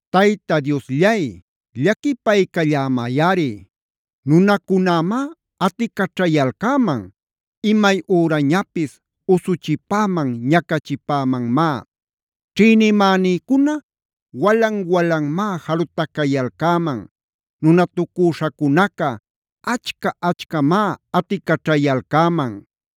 Tayta Diosllay, llaquipaycallämayꞌari. Nunacunämá aticaćhayalcäman. Imay ürañapis usuchipäman, ñacachipämanmá. Ćhïnimänïcuna walan-walanmá jalutacayalcäman. Nunatucüśhacunaca achca-achcamá aticaćhayalcäman.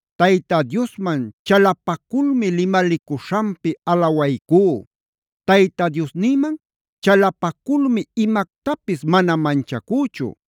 Tayta Diosman chalapaculmi limalicuśhanpi alawaycú. Tayta Diosnïman chalapaculmi imactapis mana manchacüchu.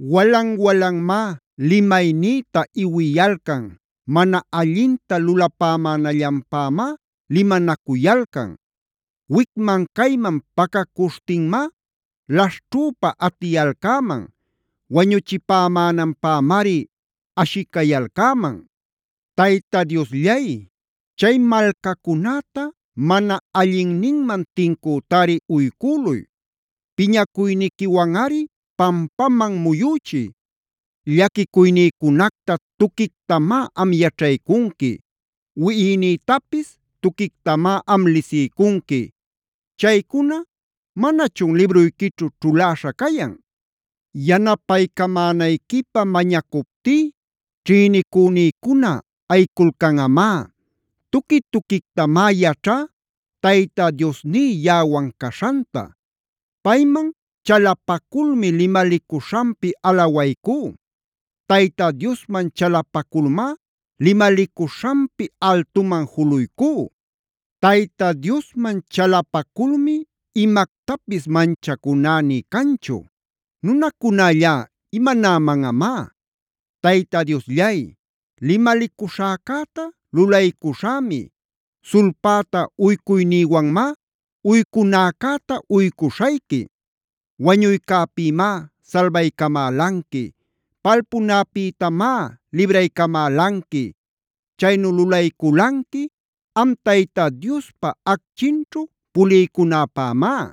Walan-walanmá limaynïta iwiyalcan. Mana allinta lulapämänallanpämá limanacuyalcan. Wicman-cayman pacacuśhtinmá laśhćhüpa aticayalcäman. Wañuchipämänanpämari ashicayalcäman. Tayta Diosllay, chay malcacunäta mana allinninman tincütari uycüluy. Piñacuyniquiwanꞌari pampaman muyüchiy. Llaquicuynïcunacta tuquictamá am yaćhaycunqui. Wiꞌinïtapis tuquictamá am lisiycunqui. Chaycuna ¿manachun libruyquićhu ćhuläśha cayan? Yanapämänayquipä mañacuptí ćhïnicünïcuna ayiculcanꞌamá. Tuqui-tuquictamá yaćhá Tayta Diosní yaꞌawan caśhanta. Payman chalapaculmi limalicuśhanpi alawaycú. Tayta Diosman chalapaculmá limalicuśhanpi altuman juluycú. Tayta Diosman chalapaculmi imactapis manchacuná nï canchu. ¿Nunacunällá imanämanꞌamá? Tayta Diosllay, limalicuśhäcäta lulaycuśhämi. Sulpäta uycuynïwanmá uycunäcäta uycuśhayqui. Wañuycäpïmá salbaycamälanqui. Palpunäpïtamá libraycamälanqui. Chaynu lulayculanqui am Tayta Diospa acchinćhu puliycunäpämá.